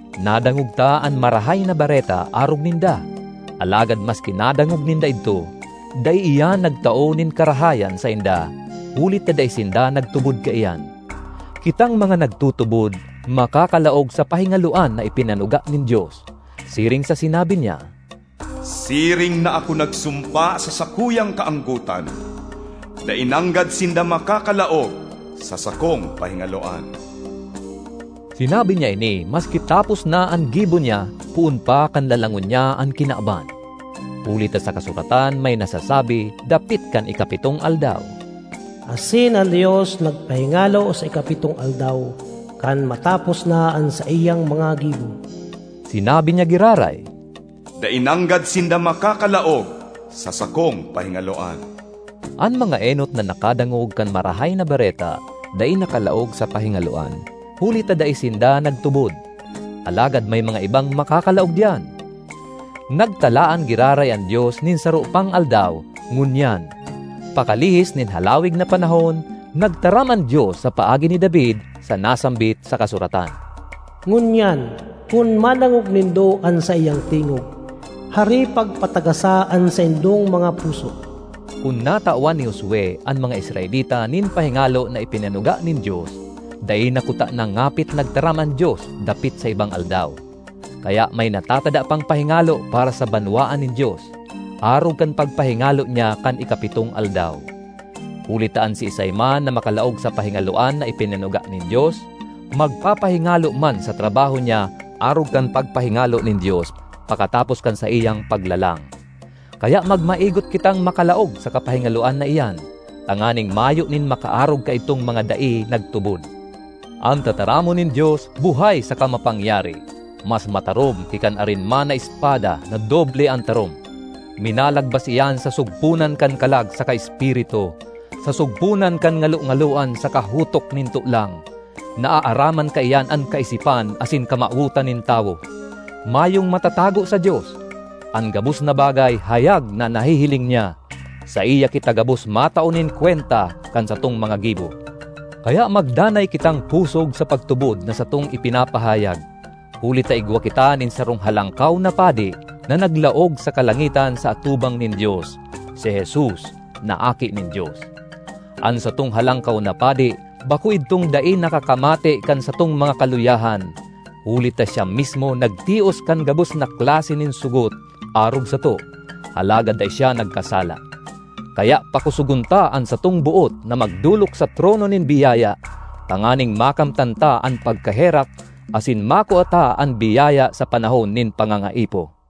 Nadangog ta an Marahay na Bareta arog ninda, alagad maski nadangog ninda idto, dai iyan nagtao nin karahayan sainda huli ta dai sinda nagtubod kaiyan. Kitang mga nagtutubod makakalaog sa pahingaloan na ipinanuga nin Dios. Siring sa sinabi niya, “Siring na ako nagsumpa sa sakuyang kaanggotan: ‘Dai nanggad sinda makakalaog sa sakong pahingaloan!’” Sinabi niya ini maski tapos na an gibo niya poon pa kan lalangon niya an kinaban. Huli ta sa Kasuratan may nasasabi dapit kan ikapitong aldaw, “Asin an Dios nagpahingalo sa ikapitong aldaw, kan matapos na an saiyang mga gibo.” Sinabi niya giraray, “Dai nanggad sinda makakalaog sa sakong pahingaloan!” An mga enot na nakadangog kan Marahay na Bareta dai nakalaog sa pahingaloan huli ta dai sinda nagtubod. Alagad may mga ibang makakalaog diyan. Nagtalaan giraray an Dios nin saro pang aldaw, “Ngunyan.” Pakalihis nin halawig na panahon, nagtaram an Dios sa paagi ni David sa nasambit sa kasuratan, “Ngunyan, kun madangog nindo an saiyang tingog, hare pagpatagasa an saindong mga puso.” Kun natawan ni Josue an mga Israelita nin pahingalo na ipinanuga nin Dios, dai na kutana ngapit nagtaram an Dios dapit sa ibang aldaw. Kaya may natatada pang pahingalo para sa banwaan nin Dios, arog kan pagpahingalo niya kan ikapitong aldaw. Huli ta an siisay man na makalaog sa pahingaloan na ipinanuga nin Dios, magpapahingalo man sa trabaho niya arog kan pagpahingalo nin Dios pakatapos kan saiyang paglalang. Kaya magmaigot kitang makalaog sa kapahingaloan na iyan, tanganing mayo nin makaarog kaidtong mga dai nagtubod. An tataramon nin Dios buhay saka mapangyari, mas matarom ki kan arin man na espada na doble an tarom. Minalagbas iyan sa sugponan kan kalag saka espiritu, sa sugponan kan ngalongaloan saka hutok nin tolang. Naaaraman kaiyan an kaisipan asin kamawotan nin tawo. Mayong matatago sa Dios. An gabos na bagay hayag na nahihiling niya. Saiya kita gabos matao nin kwenta kan satong mga gibo. Kaya magdanay kitang pusog sa pagtubod na satong ipinapahayag, huli ta igwa kita nin sarong Halangkaw na Padi na naglaog sa kalangitan sa atubang nin Dios—si Jesus, na Aki nin Dios. An satong Halangkaw na Padi bako idtong dai nakakamate kan satong mga kaluyahan, huli ta siya mismo nagtios kan gabos na klase nin sogot arog sato, alagad dai siya nagkasala. Kaya pakosogon ta an satong boot na magdolok sa trono nin biyaya, tanganing makamtan ta an pagkaherak asin makua ta an biyaya sa panahon nin pangangaipo.